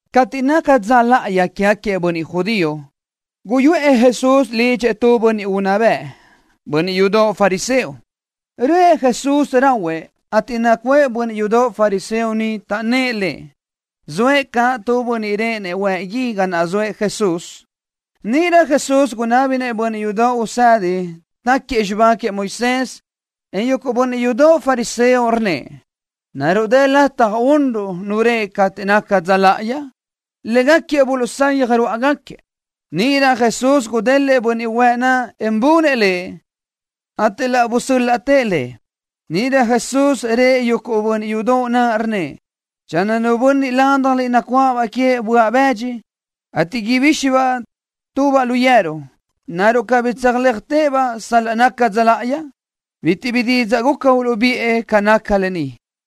Cateʼ naca dza láʼayi quégaquiëʼ bönniʼ judío, guyuʼë Jesús lidxëʼ tu bönniʼ unná bëʼ, bönniʼ yudoʼ fariseo. Röʼë Jesús rahuëʼ, ateʼ nacuʼë bönniʼ yudoʼ fariseo niʼ taʼnë́ʼë Lëʼ. Zoëʼ caʼ tu bönniʼ réʼenëʼ huëʼ gui ga naʼ zoëʼ Jesús. Níʼirö Jesús gunábinëʼ bönniʼ yudoʼ usedi táquiëʼ xibá queëʼ Moisés, en yuguʼ bönniʼ yudoʼ fariseo, rnnëʼ: —¿Naruʼ dë lataj unruʼ nu reʼe cateʼ naca dza láʼayi? Légaquiëʼ buluʼsayaj ruáʼagaquiëʼ. Níʼirö Jesús gudélëʼë bönniʼ huëʼ naʼ, en bunëʼ lëʼ, ateʼ laʼ busö́l-laʼtëʼ lëʼ. Níʼirö Jesús rëʼ yuguʼ bönniʼ yudoʼ naʼ, rnnëʼ: —Channö nu bönniʼ ládjaliʼ nacuáʼabaʼ queëʼ böaʼ bëdxi, ateʼ ibíxibaʼ tubaʼ lu yeru, ¿naruʼ cabí tsöjléajtëʼ-baʼ, sal-laʼ naca dza láʼayi? Bitiʼ bi didzaʼ guca uluʼbiʼë ca naca lë ni.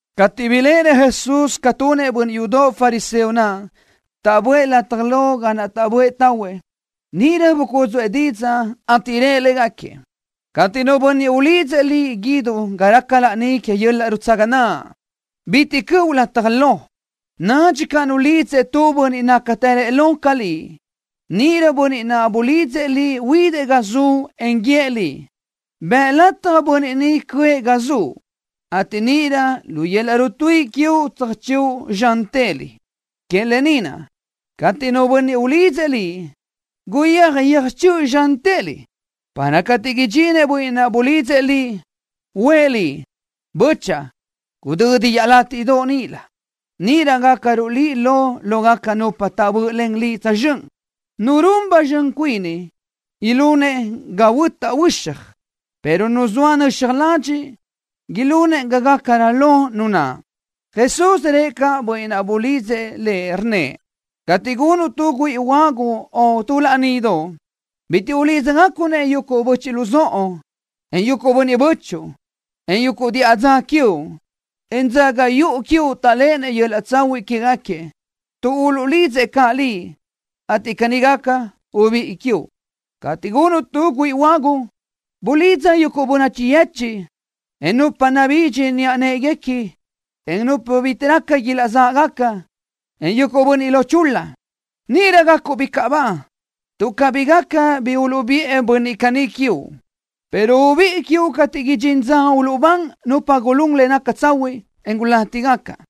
Cateʼ biléʼenëʼ Jesús ca tunëʼ bönniʼ yudoʼ fariseo naʼ, taʼböʼë lataj lo ga naʼ taʼböʼë tahuëʼ, níʼirö bucúdzuʼë didzaʼ, ateʼ rëʼ légaquiëʼ: —Cateʼ nu bönniʼ ulidzëʼ liʼ guíduʼ ga raca laní que yöl-laʼ rutsaga naʼ, bitiʼ cöʼu lataj lo. Nadxi caʼ nulidzëʼ caʼ tu bönniʼ nácatërëʼ lo ca liʼ. Níʼirö bönniʼ naʼ bulidzëʼ liʼ huidëʼ ga zuʼ, en guíëʼ liʼ: “Bëʼ lataj bönniʼ ni cöʼë ga zuʼ”, ateʼ níʼirö lu yöl-laʼ rutuíʼi quiuʼ tsöjchöʼu zxánitëlö. Que lë ni naʼ, cateʼ nu bönniʼ ulidzëʼ liʼ, guyéaj yöjchö́ʼ zxánitëlö, para cateʼ idxinëʼ bönniʼ naʼ bulidzëʼ liʼ, huëʼ liʼ: “Bö́chaʼa, gudödi iaʼlatiʼ nilö.” Níʼirö gácaruʼ liʼ lo lógaca nupa taʼböʼlen liʼ tsözxö́n. Nu run ba zxön cuini, ilunëʼ ga huötaʼ huöxaj, pero nu zoa nöxaj ladxiʼ, ilunëʼ ga gácarö lo nu naʼ. Jesús rëʼ caʼ bönniʼ naʼ bulidzëʼ Lëʼ, rnnëʼ: —Catiʼ gunuʼ tu güíʼi huagu o tu lanídoʼ, bitiʼ ulídzagacuʼ-nëʼ yuguʼ böchiʼ luzóʼo, en yuguʼ bönniʼ bö́chuʼu, en yuguʼ diʼa dza quiuʼ, en dzaga yuʼu quiuʼ taʼléʼenëʼ yöl-laʼ tsahuiʼ quégaquiëʼ, tuʼ uluʼlidzëʼ caʼ liʼ, ateʼ caní gaca, ubíʼi quiuʼ. Cateʼ gunuʼ tu güíʼi huagu, bulidza yuguʼ bönachi yechiʼ, en nupa nabixi niʼa náʼagaca, en nupa bitiʼ raca sáʼgaca, en yuguʼ bönniʼ lo chul-la. Níʼirö gacuʼ bicaʼ ba, tuʼ cabí gaca bi uluʼbiʼë bönniʼ caní quiuʼ, pero ubíʼi quiuʼ cateʼ idxín dza uluʼbán nupa gulún le naca tsahuiʼ, en gulátigaca.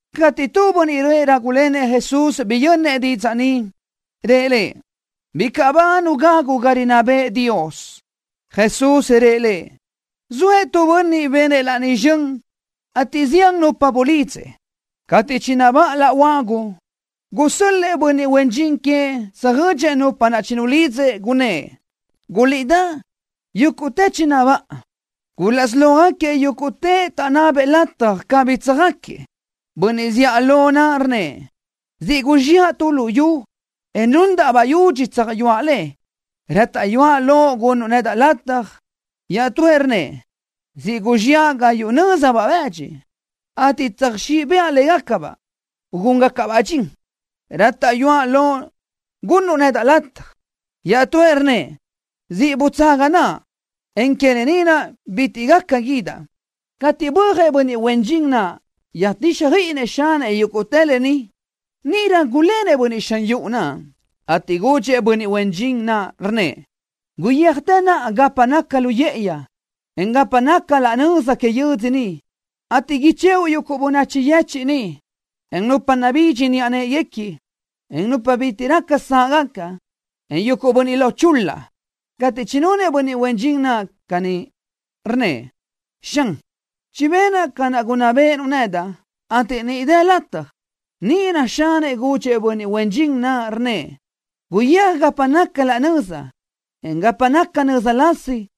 Cateʼ tu bönniʼ röʼë rágulenëʼ Jesús biyönnëʼ didzaʼ ni, rëʼ Lëʼ: —Bicaʼ ba nu gagu ga niʼ rinná bëʼë Dios. Jesús rëʼ lëʼ: —Zoëʼ tu bönniʼ benëʼ laní zxön, ateʼ zián nupa bulidzëʼ. Cateʼ chinabáʼa laʼ huagu, gusö́l-lëʼë bönniʼ huen dxin queëʼ tsöjödxëʼ nupa naʼ chinulidzëʼ, gunnë́ʼ: “¡Guliʼdá! ¡Yúguʼtë chinabáʼa!” Gulaʼsí lógaquiëʼ yúguʼtëʼ taʼnabëʼ lataj cabí tsöjáquiëʼ. Bönniʼ zíʼalö naʼ rnnëʼ: “Siʼ guzxiʼa tu luyú, en rundaʼ bayudxi tsöjyúaʼ le. Rátaʼyuaʼ loʼ gunnuʼ nedaʼ lataj.” Iaʼtúëʼ rnnëʼ: “Siʼ guzxiʼa gayuʼ nö́zabaʼ bëdxi, ateʼ tsöjzxíʼ bëʼa légacabaʼ ugúngacaʼ-baʼ dxin. Rátaʼyuaʼ loʼ gunnuʼ nedaʼ lataj.” Iaʼtúëʼ rnnëʼ: “Siʼ butsaga naʼa, en que lë ni naʼ bitiʼ gaca guídaʼ.” Cateʼ bö́ajëʼ bönniʼ huen dxin naʼ, yöjtíxjöiʼinëʼ xanëʼ yúguʼtë lë ni. Níʼirö gulénëʼ bönniʼ xan yuʼu naʼ, ateʼ gudxëʼ bönniʼ huen dxin naʼ, rnnëʼ: “Guyéajtë naʼa gapa naca lu yë́ʼëyi, en gapa naca laʼ nöza que yödzö ni, ateʼ ichëʼu yuguʼ bönachi yechiʼ ni, en nupa nabixi niʼa náʼagaca, en nupa bitiʼ raca sáʼgaca, en yuguʼ bönniʼ lo chul-la.” Cateʼ chinunëʼ bönniʼ huen dxin naʼ caní, rnnëʼ: “Xan, chibenaʼ ca naʼ gunná béʼenuʼ nedaʼ, ateʼ ni dë lataj.” Níʼirö xanëʼ gudxëʼ bönniʼ huen dxin naʼ, rnnëʼ: “Guyéaj gapa naca laʼ nöza, en gapa naca nöza lasi,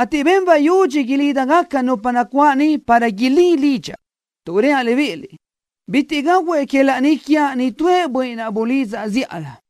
ateʼ ben bayudxi guídigaca nupa nacuáʼ niʼ para ilí lidxaʼ, tuʼ reaʼ libíʼiliʼ: Bitiʼ gahuëʼ que laní quiaʼ nitúëʼ bönniʼ niʼ bulidzaʼ zíʼalö.”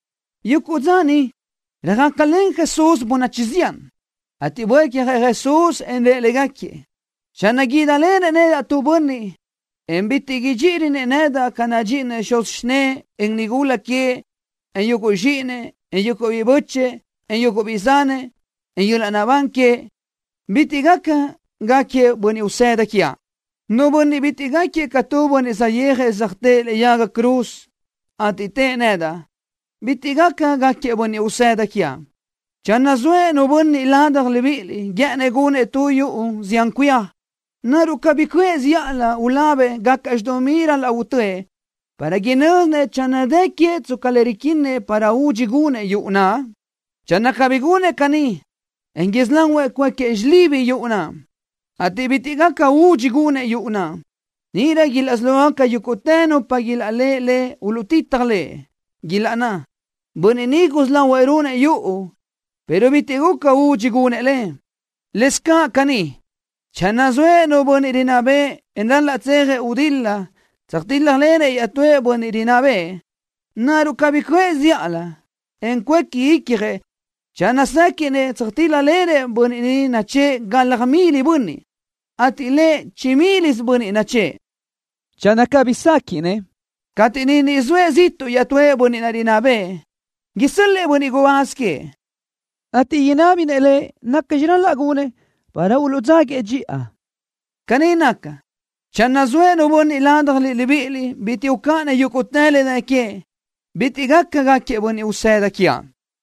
Yuguʼ dza niʼ röjácalen Jesús bönachi zián, ateʼ buécjëʼ Jesús, en rëʼ légaquiëʼ: —Channö guídalenëʼ nedaʼ tu bönniʼ, en bitiʼ idxíʼirönëʼ nedaʼ ca nadxíʼinëʼ xuz xinë́ʼë, en nigula queëʼ, en yuguʼ zxíʼinëʼ, en yuguʼ biʼi bö́chëʼë, en yuguʼ biʼi zanëʼ, en yöl-laʼ naʼbán queëʼ, bitiʼ gaca gáquiëʼ bönniʼ usëda quiaʼ. Nu bönniʼ bitiʼ gáquiëʼ ca tu bönniʼ saʼyéajëʼ söjtë́ʼë lëʼe yaga cruz, ateʼ tëʼë nedaʼ, bitiʼ gaca gáquiëʼ bönniʼ usëda quiaʼ. Channö zoëʼ nu bönniʼ ladaj libíʼiliʼ guë́ʼënnëʼ gunëʼ tu yuʼu zián cuía, ¿naruʼ cabí cöʼë zíʼalö ulabëʼ gácaʼxi dumí ral-laʼ utö́ëʼ para inö́zinëʼ channö dë queëʼ tsca le riquinnëʼ para údxi gunëʼ yuʼu naʼ? Channö cabí gunëʼ caní, en isí lahuëʼ cuéquiëʼ xilibi yuʼu naʼ, ateʼ bitiʼ gaca údxi gunëʼ yuʼu naʼ, níʼirö ilaʼsí lógaca yúguʼtë nupa ilaʼléʼe le uluʼtitaj lëʼ, ilaʼnná: “Bönniʼ ni gusí lahuëʼ runëʼ yuʼu, pero bitiʼ guca údxi gunëʼ le.” Lëscaʼ caní, channö zoëʼ nu bönniʼ rinná bëʼë, en ral-laʼ tsejëʼ gudil-la tsöjtíl-lalenëʼ iaʼtúëʼ bönniʼ rinná bëʼë, ¿naruʼ cabí cöʼë zíʼalö, en cuéqui icjëʼ channö séquiʼnëʼ tsöjtíl-lalenëʼ bönniʼ niʼ nachë́ʼë galaj milëʼ bönniʼ, ateʼ lëʼ chi milsëʼ bönniʼ nachë́ʼë? Channö cabí séquiʼnëʼ, cateʼ niʼ zoëʼ ziʼtuʼ iaʼtúëʼ bönniʼ naʼ rinná bëʼë, isö́l-lëʼë bönniʼ gubáz queëʼ, ateʼ inábinëʼ lëʼ nacxi ral-laʼ gunëʼ para uluʼdzáguiëʼ dxiʼa. Caní naca, channö zoëʼ nu bönniʼ ladaj libíʼiliʼ bitiʼ ucáʼanëʼ yúguʼtë le dë queëʼ, bitiʼ gaca gáquiëʼ bönniʼ usëda quiaʼ.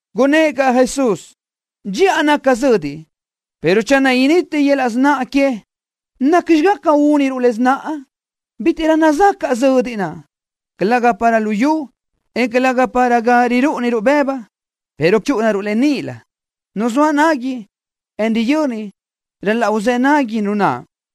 Gunnë́ʼ caʼ Jesús: —Dxiʼa naca zödiʼ, pero channö initi yöl-laʼ sináʼa que, ¿nacxi gaca úniruʼ le sináʼa? Bítiʼrö nazacaʼ zödiʼ naʼ, calëga para luyú, en calëga para ga rirúʼuniruʼ bëbu, pero chúʼunaruʼ le níʼilö. Nu zoa nagui, en riyöni, ral-laʼ uzë́ nagui nu naʼ.